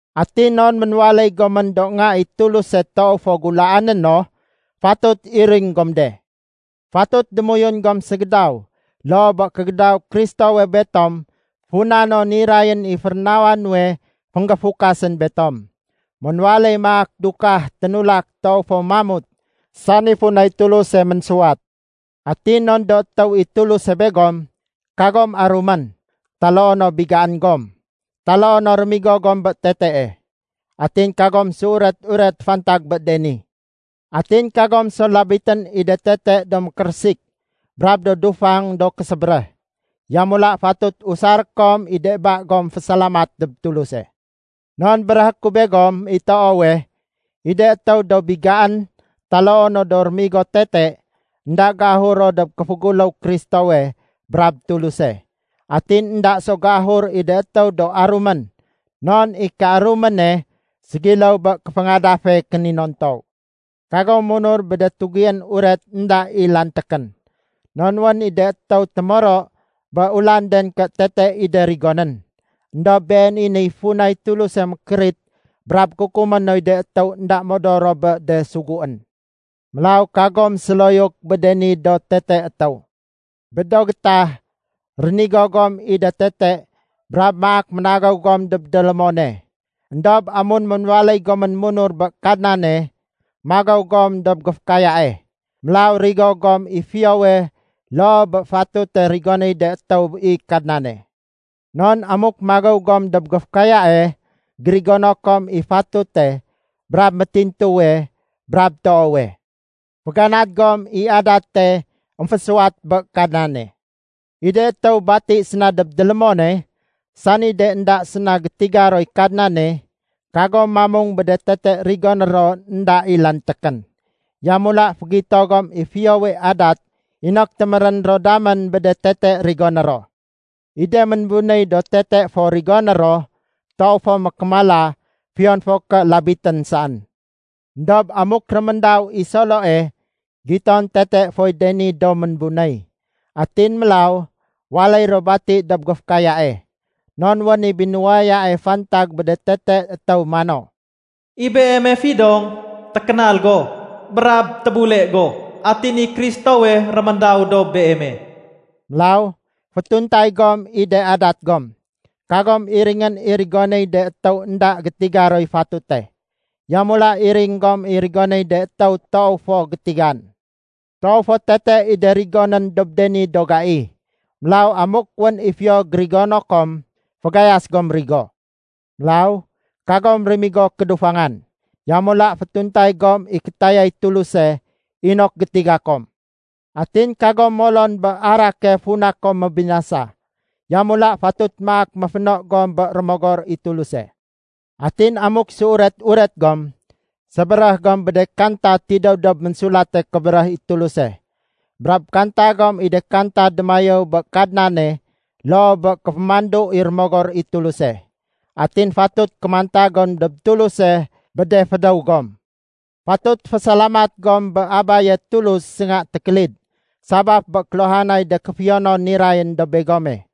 Atin non ménwaléy gomén do nga i Tuluse toow fo gulaané no, fatut iring gom de. Fatut démoyun gom ségédaw loo bé kégédaw Kristowe betom funa no nirayén i férénawa nuwe fénggéfukas betom. Ménwaléy maak dukah ténulak toow fo mamut, sani funay Tuluse ménsuwat. Atin non do étéw i Tuluse begom, kagom arumén, taloo no bigaén gom, taloo no rémigo gom bé tetee. Atin kagom séuret-uret fantag bé de ni. Atin kagom so labitén i de tete do mékérésik brab do dufang do késébéréh. Yamula fatut usaré kom i de ba gom fésalamat dob Tuluse. Non béréhé ku begom i toowe, i de étéw do bigaén taloo no do rémigo tete, énda géahur ro dob kéféguléw Kristowe brab Tuluse. Atin énda so géahur i de étéw do arumén non i kéaruméne ségiléw bé kéféngadafe kéninontow. Kagom munur bé de tugién uret énda i lantékén. Non wén i de étéw témoro bé ulanden ké tete i de rigonén. Endob been i de niy funay Tuluse mékérit brab kukumé noy de étéw énda modor ro bé de suguén. Mélaw kagom séloyuk bé de ni do tete étéw. Bé do gétah, rénigo gom i de tete brab maak ménagéw gom dob délémone. Endob amun ménwaléy gomén munur bé Kadnane, magéw gom dob géfékayae. Mélaw rigo gom i fiyowe loo bé fatute rigonéy de étéw i Kadnane. Non amuk magéw gom dob géfékayae, gérigono kom i fatute brab métintuwe brab toowe. Féganad gom i adate émfésuwat bé Kadnane. I de étéw bati séna dob délémone, sani de énda séna gétiga roy Kadnane, kagom mamung bé de tete rigoné ro énda i lantékén. Yamula fégito gom i fiyowe adat inok témérén ro damén bé de tete rigoné ro. I de ménbunéy do tete fo rigoné ro, toow fo mékémala fiyon fo ké labitén saén. Endob amuk réméndaw i Soloe, giton tete foy de ni do ménbunéy. Atin mélaw waléy ro bati dob géfékayae. Non wén i binuwayae fantag bé de tete étéw mano, “I beeme fidong, tékénal go, brab tébule go! Atin i Kristowe réméndaw dob beeme.” Mélaw fétuntay gom i de adat gom. Kagom iringén i rigonéy de étéw énda gétiga roy fatute. Yamula iring gom i rigonéy de étéw toow fo gétigan. Toow fo tete i de rigonén dob de ni do gai. Mélaw amuk wén i fiyo gérigono kom, fagayas gom rigo. Mélaw kagom rémigo kédufangan. Yamula fétuntay gom i kétayay Tuluse, inok gétiga kom. Atin kagom molon bé arake funa kom mébinasa. Yamula fatut maak méféno gom bé Rémogor i Tuluse. Atin amuk séuret-uret gom, sébéréh gom bé de kanta tidéw dob Ménsulate Kébéréh i Tuluse. Brab kanta gom i de kanta démayéw bé Kadnane loo bé kéfémandu i Rémogor i Tuluse. Atin fatut kémanta gom dob Tuluse bé de fédéw gom. Fatut fésalamat gom bé Abaye Tulus sénga tékélid sabaf bé kéluhanay de kéfiyonon nirayén dob begome.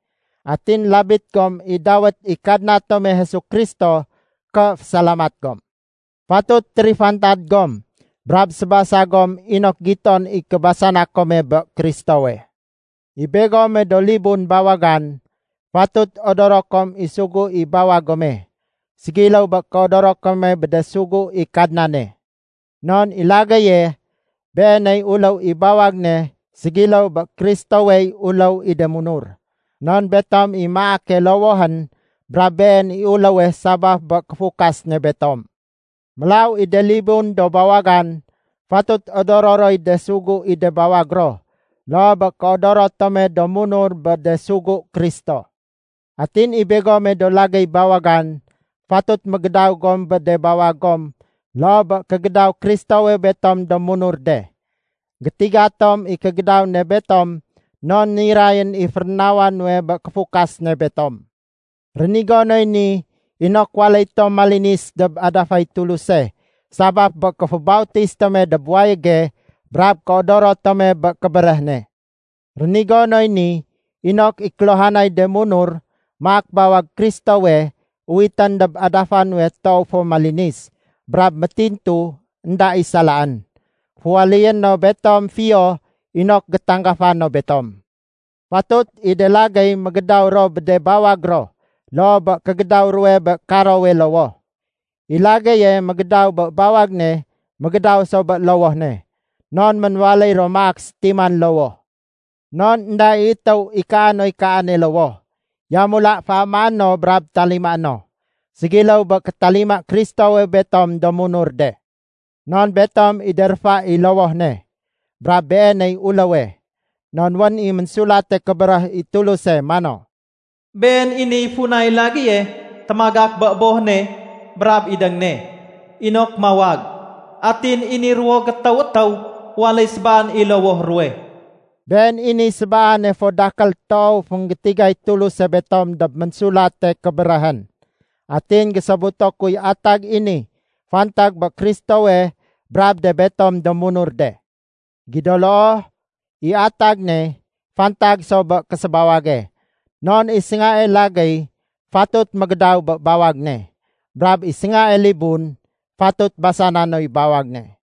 Atin labit gom i dawét i Kadna tome Jesu Kristo ké fésalamat gom. Fatut térifantad gom brab sébasa gom inok giton i kébasana kome bé Kristowe. I begome do libun bawagan, fatut odoro kom i sugu i bawag gome, ségiléw bé kéodoro kome bé de sugu i Kadnane. Non i lagéye, beeney uléw i bawag ne ségiléw bé Kristowey uléw i de munur. Non betom i maake lowohén brab Been i uléwe sabaf bé kéfukas ne betom. Mélaw i de libun do bawagan, fatut odoro roy de sugu i de bawag ro loo bé kéodoro tome do munur bé de sugu Kristo. Atin i begome do lagéy bawagan, fatut mégédaw gom bé de bawag gom loo bé kégédaw Kristowe betom do munur de. Gétiga tom i kégédaw ne betom non nirayén i férénawa nuwe bé kéfukas ne betom. Rénigo noy ni inok waléy tom malinis dob adafay Tuluse, sabaf bé kéfébautis tome dob wayége brab kéodoro tome bé kébéréh ne. Rénigo noy ni inok i kéluhanay de munur maak bawag Kristowe, uwitén dob adafa nuwe toow fo malinis, brab métintu énda i salaén. Féwaléyé no betom fiyo inok gétanggafa no betom. Fatut i de lagéy mégédaw ro bé de bawag ro loo bé kégédaw ruwe bé karowe lowoh. I lagéye mégédaw bé bawag ne mégédaw so bé lowoh ne, non ménwaléy ro maak sétiman lowoh. Non énda i étéw ikaa noy kaane lowoh. Yamula féamaé no brab talimaé no, ségiléw bé kétalima Kristowe betom do munur de. Non betom i de réfa i lowoh ne. Brab Beeney uléwe. Non wén i Ménsulate Kébéréh i Tuluse mano, “Been i niy funay lagéye témagak bé boh ne brab idéng ne inok mawag. Atin i ni ruwo gétéw étéw waléy sébaan i lowoh ruwe.” Been i niy sébaane fo dakél toow fénggétigay Tuluse betom dob Ménsulate Kébéréhén. Atin gésobuto kuy atag i ni fantag bé Kristowe brab de betom do munur de. Gido loo, i atag ne fantag so bé késébawage. Non i séngae lagéy fatut mégédaw bé bawag ne. Brab i séngae libun fatut basana noy bawag ne.